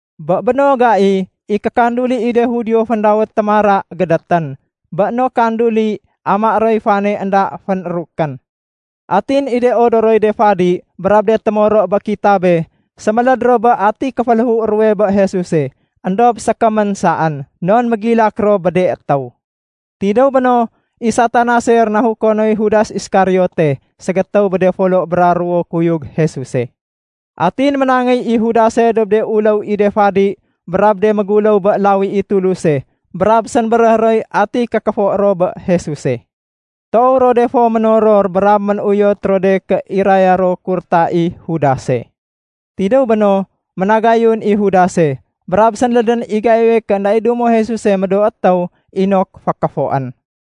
Bé béno gai, i kékanduli i de Judio féndawét “Témara” gédétén. Bé no kanduli, amaé roy fane énda fénrukén. Atin i de odoroy de fadi brab de témoro bé kitabé séméléd ro bé ati kéféléhu ruwe bé Jesuse. Endob sékémén saén, non mégilak ro bé de étéw. Tidéw béno, i Satanase rénahuko noy Judas Iskariote ségétéw bé de folo bra ruwo kuyug Jesuse. Atin ménangéy i Judase dob de uléw i de fadi brab de méguléw bé lawi i Tuluse brab sénbéréh roy ati kékéfo ro bé Jesuse. Toow ro de fo ménoror brab ménuyot ro de ké iraya ro kurta i Judase. Tidéw béno, ménagayun i Judase, brab sénlédén i gaiwe ké énda i dumo Jesuse médoo étéw inok fékéfoén.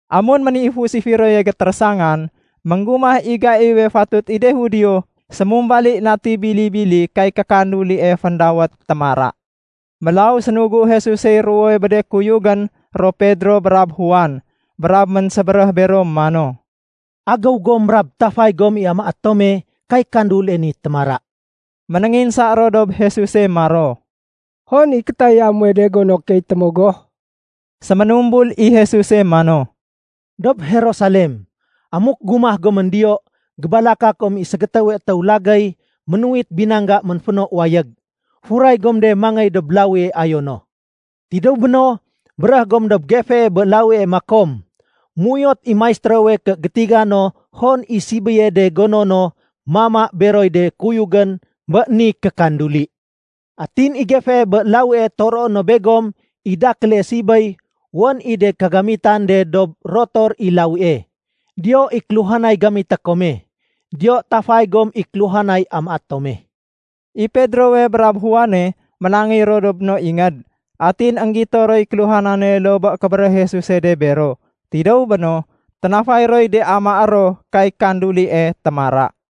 Amun ménifus i firoye gétérésangan, ménggumah i gaiwe fatut i de Judio sémumbali nati bili-bili kay kékandulie féndawét “Témara”. Mélaw sénugu Jesusey ruwowe bé de kuyugén ro Pedro brab Juan. Brab ménsébéréh bero mano, “Agéw gom brab tafay gom i amaé tome kay kandulie ni ‘Témara’.” Ménénginsa ro dob Jesuse maro, “Hon i kétaya muwe de gono key témogoh?” Séménumbul i Jesuse mano, “Dob Jerusalem. Amuk gumah gomén diyo gébalaka kom i ségétéwe étéw lagéy ménuwit binangga ménféno wayég. Furay gom de mangéy dob lawie ayo no. Tidéw béno, béréh gom dob gefee bé lawie makom, ‘Méuyot i Maistérowe ké gétiga no hon i sibéye de gono no mama beroy de kuyugén bé ni kékanduli.’ Atin i gefee bé lawie toroé no begom i dakéle sibéy wén i de kagamitan de dob rotor i lawie. Diyo i kéluhanay gamité kome. Diyo tafay gom i kéluhanay amaé tome.” I Pedrowe brab Juane ménangéy ro dob no ingéd. Atin énggito roy kéluhanane loo bé kébéréh Jesuse de bero. Tidéw béno, ténafay roy de amaé ro kay kandulie “Témara”.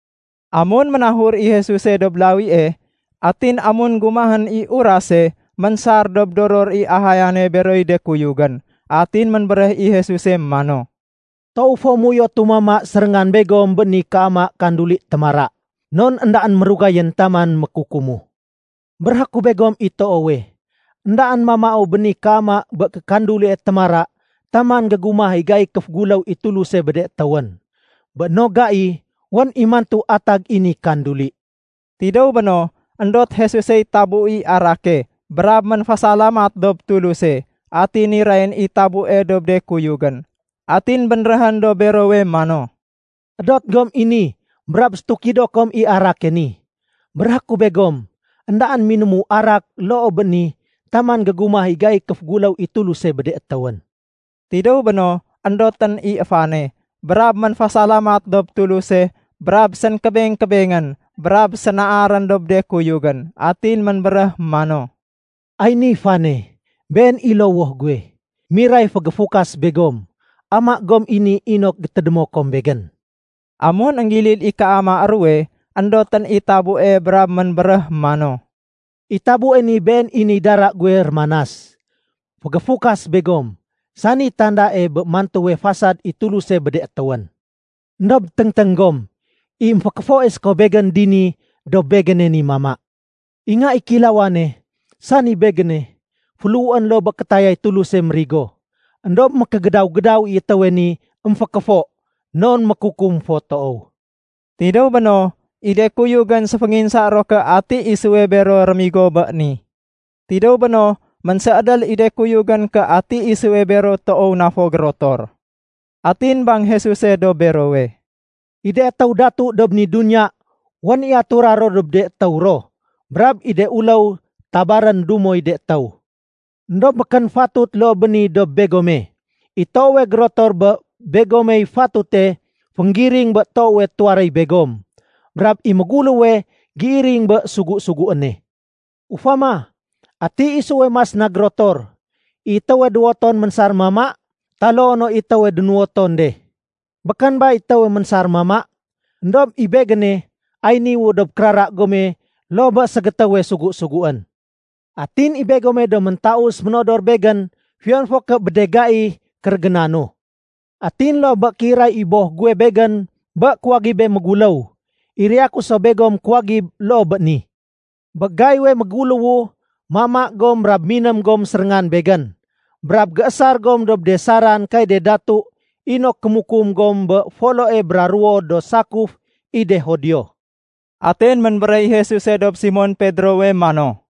Amun ménahur i Jesuse dob lawie, atin amun gumahén i urase, ménsar dob doror i ahayane beroy de kuyugén. Atin ménbéréh i Jesuse mano, “Toow fo méuyotu mama séréngan begom bé ni kéama kanduli ‘Témara’ non éndaén mérugayén taman mékukumu. Béréhé ku begom i toowe, éndaén mamau bé ni kéama bé kékandulie ‘Témara’ taman gégumah i gaiy kéféguléw i Tuluse bé de étéwén. Bé no gai, wén i mantu atag i ni kanduli.” Tidéw béno, éndot Jesusey tabu i arake brab ménfésalamat dob Tuluse. Atin nirayén i tabue dob de kuyugén. Atin bénréhén dob berowe mano, “Edot gom i ni brab sétukido kom i arake ni. Béréhé ku begom, éndaén minému arak loo bé ni taman gégumah i gaiy kéféguléw i Tuluse bé de étéwén.” Tidéw béno, éndotén i fane, brab ménfésalamat dob Tuluse brab sénkébeng-kébengén, brab sénaarén dob de kuyugén. Atin ménbéréh mano, “Ay ni fane. Been i lowoh guwe, niray fégéfukas begom. Ama gom i ni inok gétédémo kom Begén.” Amun énggilid i kéama ruwe, éndotén i tabue brab ménbéréh mano, “I tabue ni been i niy dara guwe rémanas, fégéfukas begom, sani tandae bé mantuwe fasad i Tuluse bé de étéwén. “Endob téngténg gom. I émfékéfoe séko Begén dini dob Begéne ni mama. I Nga i Kéilawane, sani Begéne, féléhuén loo bé kétayay Tuluse mérigo. Endob mékégédaw-gédaw i étéwe ni émfékéfo, non mékukum fo toow.” Tidéw béno, i de kuyugén séfénginsa ro ké ati isuwe bero rémigo bé ni. Tidéw béno, ménséédél de kuyugén ké ati isuwe bero toow na fo gérotor. Atin bang Jesuse dob berowe, “I de étéw datu dob ni duniya wén i atura ro dob de étéw ro, brab i de uléw tabarén ‘Dumoy de étéw.’ Endob békén fatut loo bé ni dob begome. I toowe gérotor bé begomey fatute fénggiring bé toowe tuwaréy begom. Brab i méguléwe géiring bé sugu-suguéne. Ufama, ati isuwe mas na gérotor, i étéwe duwoton ménsar mama, taloo no i étéwe démuwoton de? Békén ba i étéwe ménsar mama? Endob i Begéne, ay niwu dob kérara gome loo bé ségétéwe sugu-suguén. “Atin i begome do méntaus ménodor Begén fiyon fo ké bé de gai kérégénanu. Atin loo bé kéiray i Boh guwe Begén bé kuwagibé méguléw, iraya ku so begom kuwagib loo bé ni. Bé gaiwe méguléwu, mama gom brab miném gom séréngan Begén. Brab géésar gom dob de saran kay de datu inok kémukum gom bé foloe brab ruwo do sakuf i de Judio.” Atin ménbéréh i Jesuse dob Simon Pedrowe mano,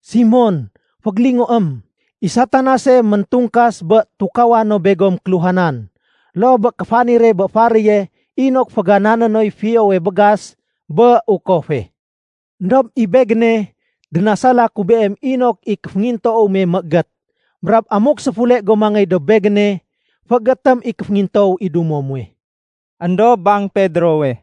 “Simon, fégélingoém. I Satanase méntungkas bé tukawa no begom kéluhanan, loo bé kéfanire bé faréye inok féganané noy fiyowe bégas bé ukofe. Endob i Begéne, dénasala ku beem inok i kéféngintoow me méégét. Brab amuk séfule go mangéy dob Begéne, féégétém i kéféngintoow i dumo muwe.” Endob bang Pedrowe,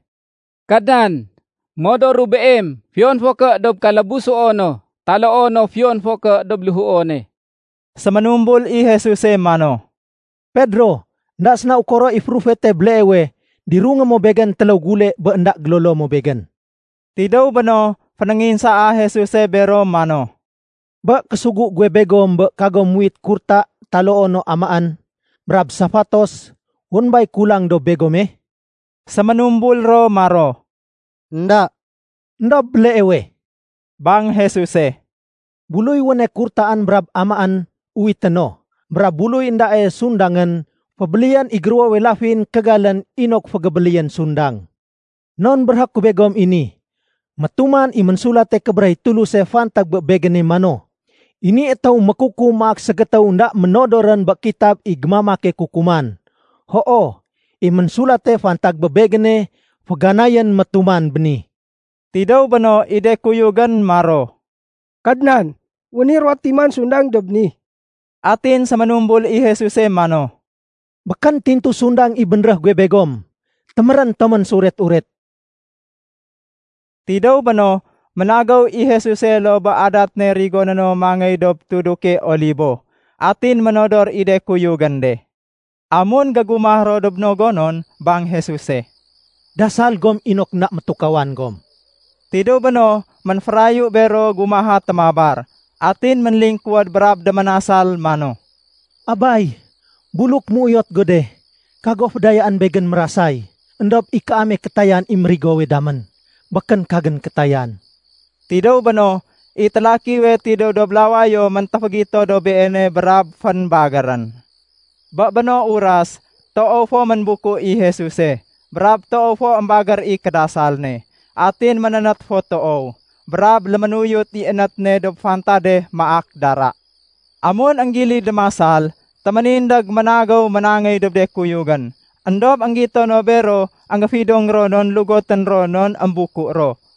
“Kadnan, modoru Beem fiyon fo ké dob kalabusuono taloo no fiyon fo ké dob léhuone.” Séménumbul i Jesuse mano, “Pedro, énda séna ukoro i férufete béleewe, dirungé mo Begén téléw gule bé énda gélolo mo Begén.” Tidéw béno, fénénginsaa Jesuse bero mano, “Bé késugu guwe begom bé kagom muwit kurta taloo no amaén, brab safatos, wén bay kulang dob begome?” Séménumbul ro maro, “Enda.” “Endob béleewe,” bang Jesuse, “buluy wéne kurtaén brab amaén, uwité no, brab buluy éndae sundangén, fébéléyén i géruwowe lafin kégalén inok fégébéléyén sundang. Non béréhé ku begom i ni, métuman i Ménsulate Kébéréh i Tuluse fantag bé Begéne mano, ‘I ni étéw mékukum maak ségétéw énda ménodorén bé kitab i gémamake kukuman.’ Hoo, i ménsulate fantag bé Begéne féganayén métuman béni.” Tidéw béno, i de kuyugén maro, “Kadnan, wén i ruwo timan sundang dob ni.” Atin séménumbul i Jesuse mano, “Békén tintu sundang i bénréh guwe begom! Témérén tomén séuret-uret!” Tidéw béno, ménagéw i Jesuse loo bé adat ne rigoné no mangéy dob tuduke Olibo. Atin ménodor i de kuyugén de. Amun gégumah ro dob no gonon, bang Jesuse, “Dasal gom inok énda métukawan gom.” Tidéw béno, ménférayu bero gumaha témabar. Atin ménlingkuwéd brab déménasal, mano, “Abay, buluk méuyot go de, kago fédayaén Begén mérasay. Endob i kaame kétayan i mérigowe damén, békén kagén kétayan.” Tidéw béno, i télakiwe tidéw dob lawayo méntéfégito dob Beene brab fénbagérén. Bé béno uras, toow fo ménbuku i Jesuse. Brab toow fo émbagér i kédasal ne. Atin ménénét fo toow, brab léménuyut i énét ne dob fantade maak dara. Amun énggilid démasal, téménindég ménagéw ménangéy dob de kuyugén. Endob énggito no bero énggéfidong ro non lugotén ro non émbuku ro.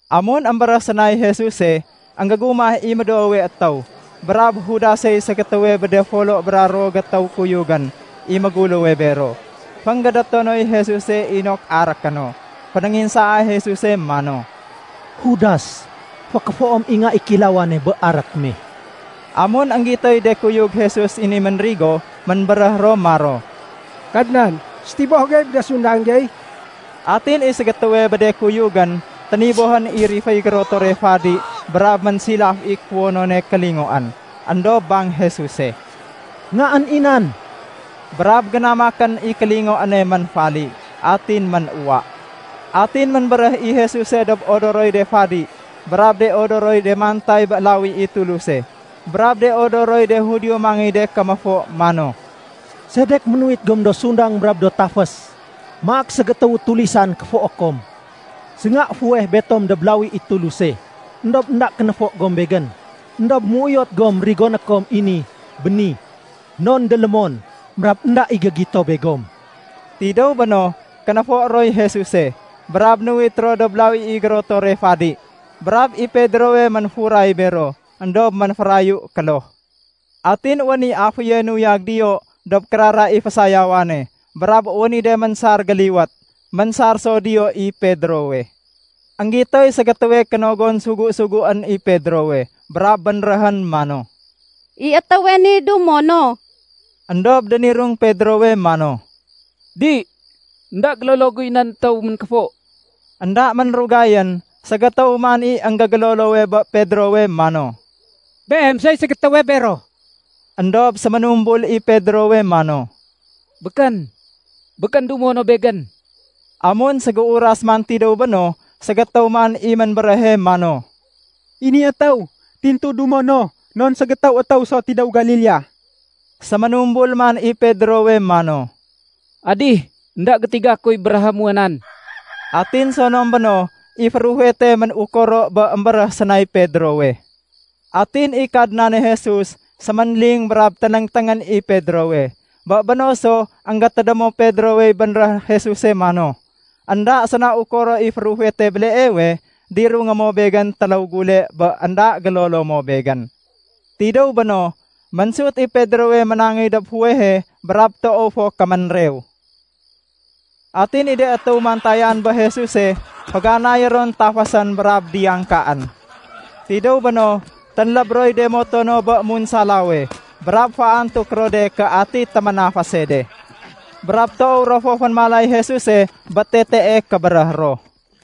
Amun émbéréh sénay Jesuse, énggégumah i médoowe étéw, brab Judasey ségétéwe bé de folo bra ruwo gétéw kuyugén i méngguléwe bero. Fénggédéto noy Jesuse inok aréké no. Fénénginsaa Jesuse mano, “Judas, fékéfoém i Nga i Kéilawane bé arék me?” Amun énggitoy de kuyug Jesus i ni ménrigo, ménbéréh ro maro, “Kadnan, sétiboh gey bé de sundang gey?” Atin i ségétéwe bé de kuyugén ténibohén i riféy gérotore fadi brab ménsilaf i kuwonone kélingoén. Endob bang Jesuse, “Ngaén i nan!” Brab génamakén i kélingoéne ménfali, atin ménuwa. Atin ménbéréh i Jesuse dob de odoroy de fadi, brab de odoroy de mantay bé lawi i Tuluse, brab de odoroy de Judio mangéy de kéméfo mano, “Sedek ménuwit gom do sundang brab do tafés, maak ségétéwu tulisan kéfoé kom? Sénga fuweh Betom dob lawi i Tuluse, éndob énda kénéfo gom Begén. Endob méuyot gom rigoné kom i ni béni, non délémon, brab énda i gégito begom.” Tidéw béno, kénéfo roy Jesuse, brab nuwit ro dob lawi i gérotore fadi. Brab i Pedrowe ménfuray bero, éndob ménférayu kloh. Atin wén i aféye nuyag diyo dob kérara i fésayawane brab wén i de ménsar géliwét. Ménsar so diyo i Pedrowe. Enggitoy ségétéwe kénogon sugu-suguén i Pedrowe brab bénréhén mano, “I étéwe ni dumo no.” Endob dénirung Pedrowe mano, “Di, énda gélolo guy nan étéw ménkéfo.” Enda ménrugayén, ségétéw man i énggégélolowe bé Pedrowe mano, “Beem soy ségétéwe bero.” Endob séménumbul i Pedrowe mano, “Békén! Békén dumo no begén!” Amun ségéuras man tidéw béno, ségétéw man i ménbéréhe mano, “I ni étéw tintu dumo no, non ségétéw étéw so tidéw Galilea.” Séménumbul man i Pedrowe mano, “Adih, énda gétiga kuy béréhé muwa nan.” Atin sonom béno, i férufete ménukoro bé émbéréh sénay Pedrowe. Atin i Kadnane Jesus séménling brab ténéngténgén i Pedrowe. Bé béno so énggétédémo Pedrowey bénréh Jesuse mano, “Enda séna ukoro i férufete béleewe, dirungé mo Begén téléw gule bé énda gélolo mo Begén.” Tidéw béno, ménsut i Pedrowe ménangéy dob fuwehe brab toow fo kéménrew. Atin i de étéw mantayan bé Jesuse féganayé ron tafésén brab diyangkaén. Tidéw béno, ténléb roy de moto no bé munsalawe brab féantuk ro de ké ati téménafése de. Brab toow ro fo fénémalay Jesuse bé tetee kébéréh ro.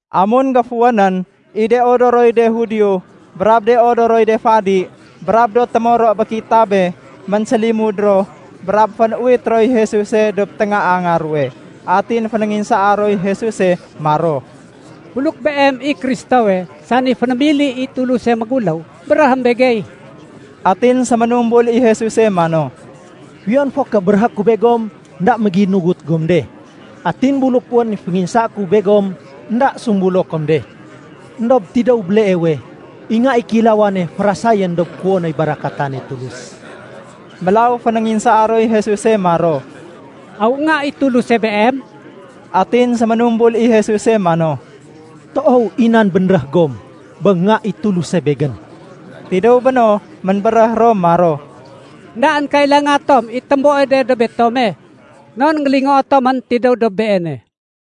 Amun géfuwénén, i de odoroy de Judio, brab de odoroy de fadi, brab do témoro bé kitabe, ménsélimud ro, brab fén-uwit roy Jesuse dob téngaanga ruwe. Atin fénénginsaa roy Jesuse maro, “Buluk Beem i Kristowe, sani fénémili i Tuluse méguléw, béréhém begey.” Atin séménumbul i Jesuse mano, “Fiyon fo ké béréhé ku begom, énda méginugut gom de. Atin buluk wén i fénginsaé ku begom, énda sumbulo kom de. Endob tidéw béleewe, i Nga i Kéilawane fésarén dob kuwonoy barakatane Tulus.” Mélaw fénénginsaa roy Jesuse maro, “Aw Nga i Tuluse Beem?” Atin séménumbul i Jesuse mano, “Toow i nan bénréh gom bé Nga i Tuluse Begén.” Tidéw béno, ménbéréh ro maro, “Endaén kailanga tom i témboe de dob betome. Non énggélingoo tomén tidéw dob Beene.”